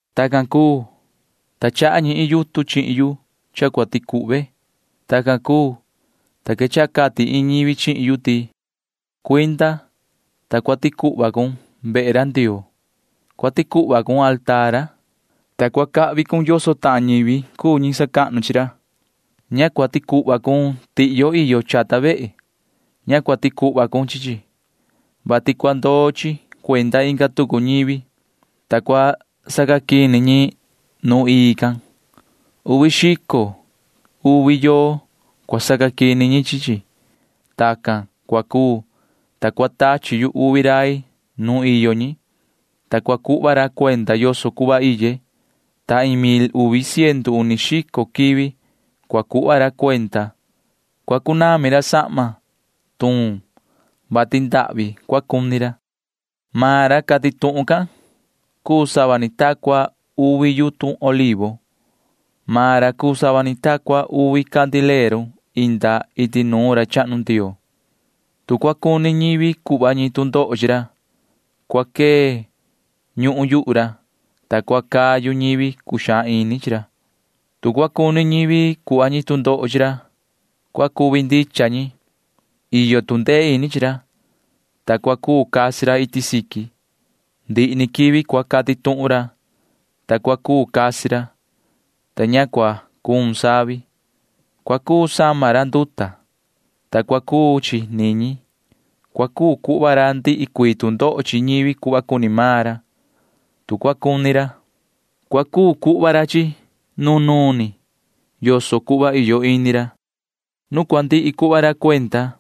Tacan cuu, ta chaha ñi iin yutun chihin yu cha cua ticuhve. Tacan cuu, ta quechaha cati iin ñivi chihin yu ti: ―Cuinda, ta cua ticuhva cun vehe ra Ndioo. Cua ticuhva cun mesa ra, ta cua cahvi cun yoso tahan ñivi cuu ñi sacahnu chi ra. Ña cua ticuhva cun tihyo iyo chata vehe. Ña cua ticuhva cun chi chi, vati cua ndoo chi cuenda inga tucu ñivi, ta cua sacaquini ñi nu ii can. Uvi xico uvi yoo cua sacaquini ñi chi chi. Tacan cua cuu, ta cua tachi yu uvi rai nuun iyo ñi, ta cua cuhva ra cuenda yoso cuhva iye, ta iin mil uvi ciendu uni xico quivi cua cuhva ra cuenda. Cua cunami ra sahma tuun, [vati ndahvi cua cuni ra]. Maan ra cati tuhun can cuu sava ni ta cua uvi yutun olivo. Maan ra cuu sava ni ta cua uvi candileru inda iti nuun ra chahnu Ndioo. Tu cua cuni ñivi cuhva ñi tu ndoho chi ra, cua quee ñuhun yuhu ra, ta cua cayu ñivi cuxaan ini chi ra. Tu cua cuni ñivi cuhva ñi tu ndoho chi ra, cua cuvi ndicha ñi. Iyo tu ndee ini chi ra, ta cua cuu casi ra iti siqui. Ndihi quivi cua cati tuhun ra, ta cua cuu casi ra, ta ña cua cuun savi. Cua cuu sama ra nduta, ta cua cuu chi niñi. Cua cuu cuhva ra ndihi cuii tu ndoho chi ñivi cuhva cuni maan ra. Tu cua cuni ra, cua cuu cuhva ra chi chi nunuun ni yoso cuhva iyo ini ra. Nu cua ndihi cuhva ra cuenda,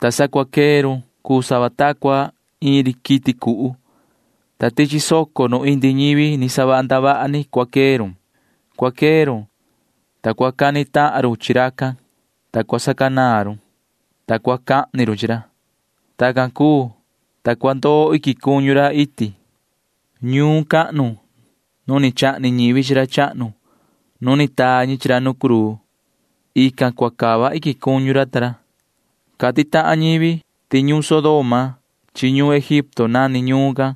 ta sa cua quee run cuu sava ta cua iin ri quiti cuhu, ta tichi soco nu indi ñivi ni savaha ndavaha ni cua quee run. Cua quee run, ta cua cani tahan run chi racan, ta cua sacanaan run, ta cua cahni run chi ra. Tacan cuu, ta cua ndoo iquin cuñu ra iti. Ñuun cahnu nu ni chahni ñivi chi ra chahnu nu ni taa ñi chi ra nu cruu―ican cua cava iquin cuñu ra ta ra. Cati tahan ñivi ti ñuun Sodoma chi ñuhun Egipto nani ñuun can.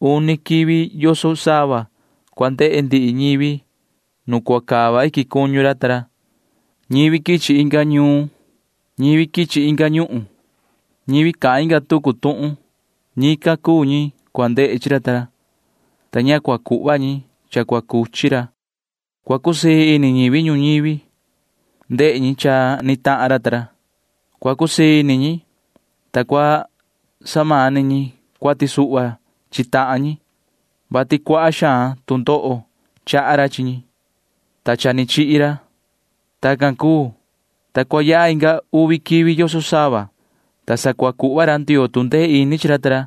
Uni quivi yoso sava cua ndehe ndihi ñivi nu cua cava iquin cuñu ra ta ra. Ñivi quichi inga ñuun, ñivi quichi inga ñuhun, ñivi cahan inga tucu tuhun―ñican cuu ñi cua ndehe chi ra ta ra, ta ña cua cuhva ñi cha cua cuchi ra. Cua cusii ini ñivi ñuñivi ndehe ñi cha ni tahan ra ta ra. Cua cusii ini ñi, ta cua samani ñi cuati suhva chi tahan ñi, vati cuaha xaan tu ndoho chaha ra chi ñi, [ta cha ni chihi ra]. Tacan cuu, ta cua yaha inga uvi quivi yoso sava, ta sa cua cuhva ra Ndioo tu ndee ini chi ra ta ra,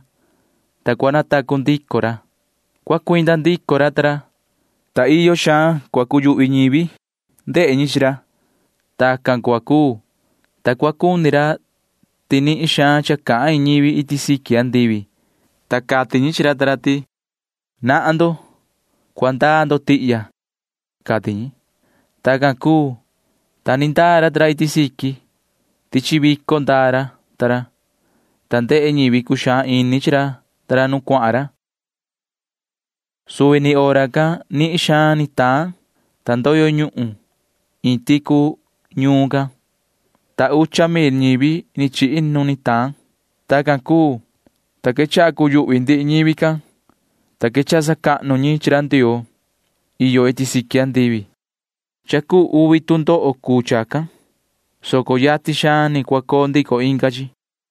ta cua natacu ndico ra. Cua cuinda ndico ra, ta nihin xaan cua quechaha cuyuhvi ñivi ndehe ñi chi ra. Tacan cua cuu, ta cua cuni soho ra ti nihin xaan cha cahan iin ñivi iti siqui andivi, ta cati ñi chi ra ta ra ti: ―Nahan ndo. Cua ndaa ndo tihya ―cati ñi. Tacan cuu, ta ni ndaa ra ta ra iti siqui. Tichi vico ndaa ra, ta ndehe ñivi cuxaan ini chi ra nu cuahan ra. Suvi ni hora can nihin xaan ni taan, ta ndoyo ñuhun iin ticu ñuun can, ta ucha mil ñivi ni chihi nu ni taan. Tacan cuu, ta quechaha cuyuhvi ndihi ñivi can, ta quechaha sacahnu ñi chi ra Ndioo iyo iti siqui andivi. Cha cuu uvi tu ndoho cuu chacan, soco yatin xaan ni cua coo ndico inga chi.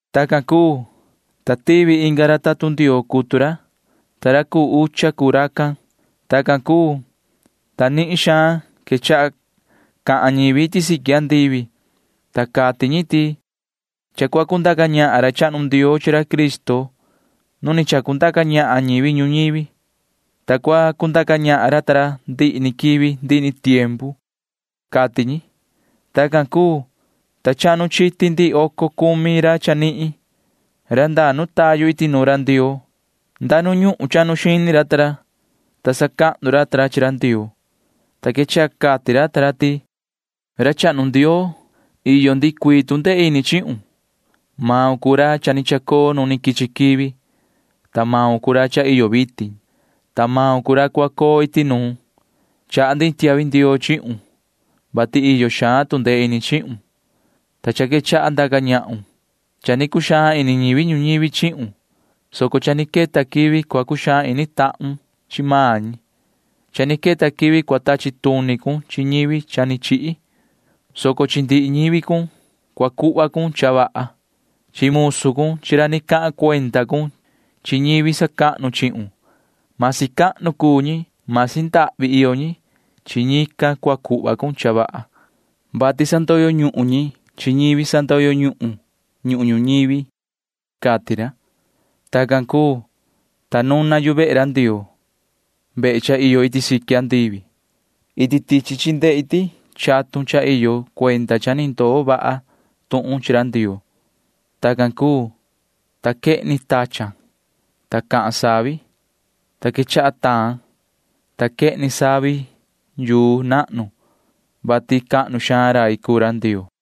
Tacan cuu, ta tivi inga ra tatun Ndioo cutu ra, ta ra cuu ucha cuu racan. Tacan cuu, ta nihin xaan quechaha cahan ñivi iti siqui andivi, ta cati ñi ti: Cha cua cundaca ñahan ra chahnu Ndioo chi ra Cristo nu ni chacundaca ñahan ñivi ñuñivi, ta cua cundaca ñahan ra ta ra ndihi ni quivi ndihi ni tiempu, cati ñi. Tacan cuu, ta chahnu chiti ndihi oco cumi ra chanihin―ra ndaa nu tayu iti nuun ra Ndioo. Nda nu ñuhun chahnu xini ra, ta sacahnu ra chi ra Ndioo, ta quechaha cati ra ti: Yoho ra chahnu Ndioo, iyo ndihi cuii tu ndee ini chihun. Maun cuu ra cha ni chacoo nu quichi quivi, ta maun cuu ra cha iyo vitin, ta maun cuu ra cua coo iti nuun. Chaha ndi iin tiahvi ndioo chihun, vati iyo xaan tu ndee ini chihun, ta cha quechaha ndaca ñahun. Cha ni cuxaan ini ñivi ñuñivi chihun, soco cha ni queta quivi cua cuxaan ini tahun chi maan ñi. Cha ni queta quivi cua tachi tuni cun chi ñivi cha ni chihi, soco chi ndihi ñivi cun cua cuhva cun cha vaha. Chi musu cun chi ra ni cahan cuenda cun chi ñivi sacahnu chihun―masi cahnu ñivi cuu ñi, masi ndahvi iyo ñi―chi ñican cua cuhva cun cha vaha, vati sandoyo ñuhun ñi chi ñivi sandoyo ñuhun ñuhun ñuñivi, cati ra. Tacan cuu, ta nuna yu vehe ra Ndioo―vehe cha iyo iti siqui andivi. Iti tichi chi ndehe ndi chatun cha iyo cuenda cha ni ndoo vaha tuhun chi ra Ndioo. Tacan cuu, ta quehni tachan, ta cahan savi, ta quechaha taan, ta quehni savi yuu nahnu, [vati cahnu xaan rai cuu ra Ndioo].